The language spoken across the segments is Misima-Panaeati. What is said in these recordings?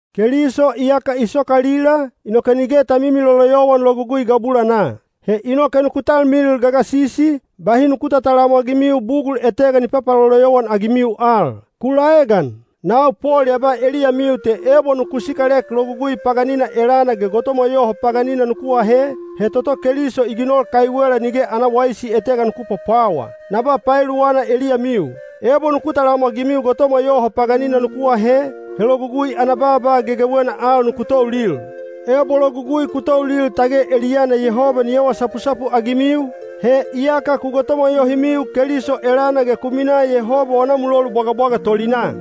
Keliso iyaka i sokalila, inoke nige ta mimiloloyowan Logugui gabulanaa. He inoke nuku talmilil gagasisi, bahi nuku tatalamwagimiu bugul etega ni papaloloyowan-agimiu al. Ku laegan! Nau Pol ya ba eliyamiu te ebo nuku sikalek Logugui paganina elana ge gotomwa yoho paganina nuku ahe, he toto Keliso i ginol kaiwela nige ana waisi etega nuku pwapwawa. Na ba paeluwana eliyamiu. Ebo nuku talamwagimiu gotomwa yoho paganina nuku ahe, he Logugui ana baaba gegewena al nuku toulil. Ebo Logugui ku toulil tage eliyana Yehoba ni awa sapusapu-agimiu, he iyaka ku gotomwa yohimiu Keliso elana ge ku minaa Yehoba wana mulolu bwagabwaga tolinaa.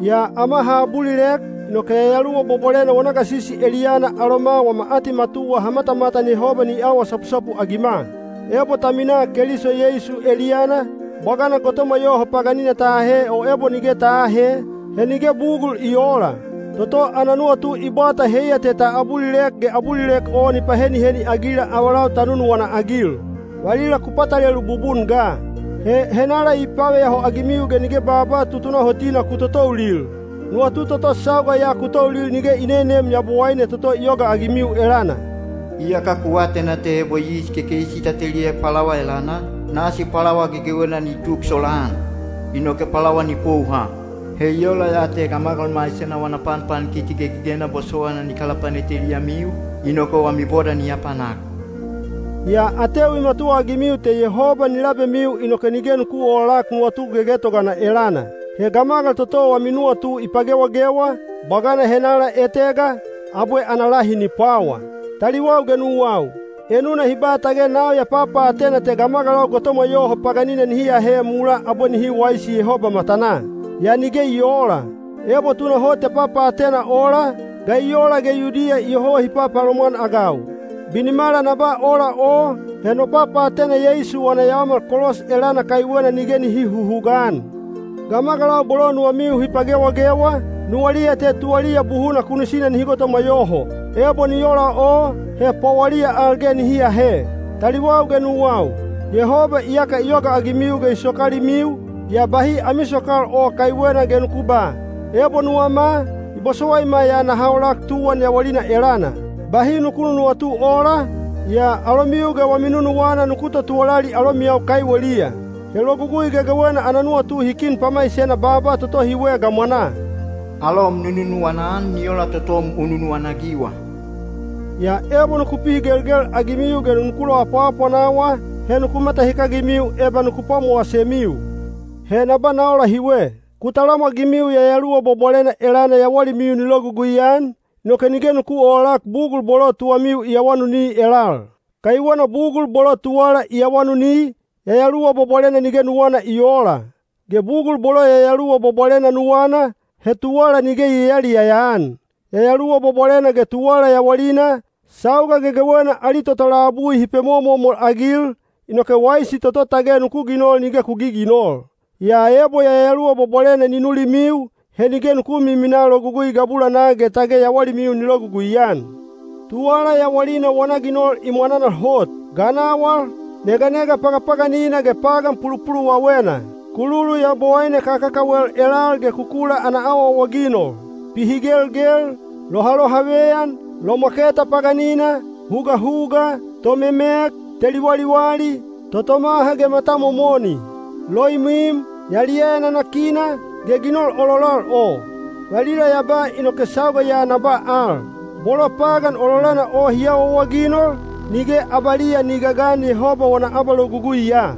Yaa ama ha abulilek, inoke Yayaluwa Bwabwalena wana gasisi eliyana aloma wama atimatuwa ha matamatan Yehoba ni awa sapusapu-agima. Ebo ta minaa Keliso Yeisu eliyana, bwagana gotomwa yoho paganina ta ahe o ebo nige ta aahe, he nige bugul i oola. Toto ana nuwatu i bwata heiya te ta abulilek ge abulilek o ni paheniheni-agila avalau ta nunuwana-agil. Valila ku patalelu bubun ga. He henala i paveyaho-agimiu ge nige baaba tutunahotina ku totoulil? Nuwatu toto sauga ya ku toulil nige i nenem Yabowaine toto i yogaagimiu elana. Iyaka ku atena te ebo yis kekeisi ta teliek pwalawa elana, nasi pwalawa gegewena ni tuk solaan, inoke pwalawa ni pouha. He i ola ya te gamagal maisena wana panpankiti gegegena bosowaina ni kalapanet eliyamiu, inoke wami boda ni apanak. Yaa ateu i matuwaagimiu te Yehoba ni labemiu inoke nige nuku oolak nuwatu gegetogana elana. He gamagal toto wami nuwatu i pagewagewa, bwagana henala etega, abwe ana lahi ni pwawa. Taliwau ge nuwau, enuna hi ba tage nau ya papaatena te gamagalau gotomwa yoho paganina nihi ahe mulaa abwe nihi waisi Yehoba matanaa. Yaa nige i oola. Ebo tunahot ya papaatena ola, ga i ola ge Yudiya iyoho hi papalomwan-agau? Binimala na ba ola o, he no papaatena Yeisu wana yaomal kolos elana kaiwena nige nihi huhugaan. Gamagalau bolo nuwamiu hi pagewagewa, nuwaliya te tuwaliya buhuna kunisina nihi gotomwa yoho. Ebo ni ola o, he pwawaliya al ge nihi ahe! Taliwau ge nuwau, Yehoba iyaka i yogaagimiu ge i sokalimiu, yaa bahi ami sokal o kaiwena ge nuku ba, “Ebo nuwama, i bosowaima ya naha olak tuwan yawalina elana.” Bahi nuku nunuwatu ola, yaa alomiu ge wami nunuwana nuku totuwalali alomiyau kaiweliya. He Logugui gegewena ana nuwatu hi kin pamaisena baaba toto hiwe gamwanaa: “Alom nu nunuwana-an ni ola totom u nunuwana-agiwa.” Yaa ebo nuku pihigelgel-agimiu ge nuku loapwaapwanawa, he nuku matahikagimiu eba nuku pwamowasemiu. He na ba na ola hiwe: ku talamwagimiu Yayaluwa Bwabwalena elana yawalimiu ni logugui-an, inoke nige nuku oolak bugul bolo tuwamiu i awanuni elal. Kaiwena bugul bolo tuwala i awanuni, Yayaluwa Bwabwalena nige nuwana i oola. Ge bugul bolo Yayaluwa Bwabwalena nuwana, he tuwala nige i yayaliyaya-an. Yayaluwa Bwabwalena ge tuwala yawalina, sauga gegewena ali toto labui hi pemomomol-agil, inoke waisi toto tage nuku ginol nige ku giginol. Yaa ebo Yayaluwa Bwabwalena ni nulimiu, he nige nuku miminaa logugui gabulanaa ge tage yawalimiu ni logugui-an. Tuwala yawalina wana ginol i mwananal hot: ganawal, neganega pagapaganina ge pagan pulupuluwawena; kululu yabowaine kakakawel elal ge kukula ana awaawaginol; pihigelgel, lohalohaveyan, lomwaketa paganina, hugahuga, tomemek, teli waliwali, totomaha ge matamomoni; loimwim, yaliyaya nanakina, ge ginol ololal o. Valila ya ba inoke sauga ya na ba al: bolo pagan ololana o hi awaawaginol, nige abaliya ni gagan Yehoba wana abaloguguiya.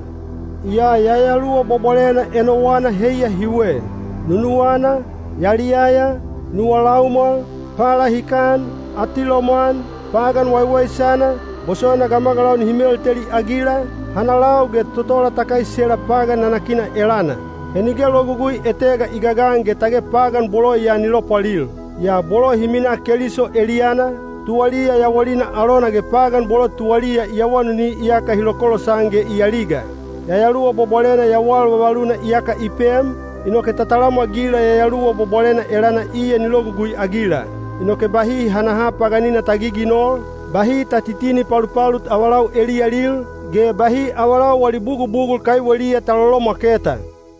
Yaa Yayaluwa Bwabwalena enowana heiya hiwe: nunuwana, yaliyaya, nuwa laumwal, palahikan, atilomwan, pagan waiwaisana, bosowaina gamagalau nihi melteli-agila, hanalau ge totola ta kaisela pagan nanakina elana. He nige logugui etega i gagan ge tage pagan bolo ya ni lopwalil. Yaa bolo hi minaa Keliso eliyana, tuwaliya yawalina alona ge pagan bolo tuwaliya i awanuni iyaka hi lokolosan ge i aliga. Yayaluwa Bwabwalena yawal vavaluna iyaka i pem, inoke ta talamwagila Yayaluwa Bwabwalena elana iya ni logugui-agila. Inoke bahi hanaha paganina ta giginol, bahi ta titini palupalut avalau eliyalil, ge bahi avalau wali bugubugul kaiweliya ta lolomwaketa.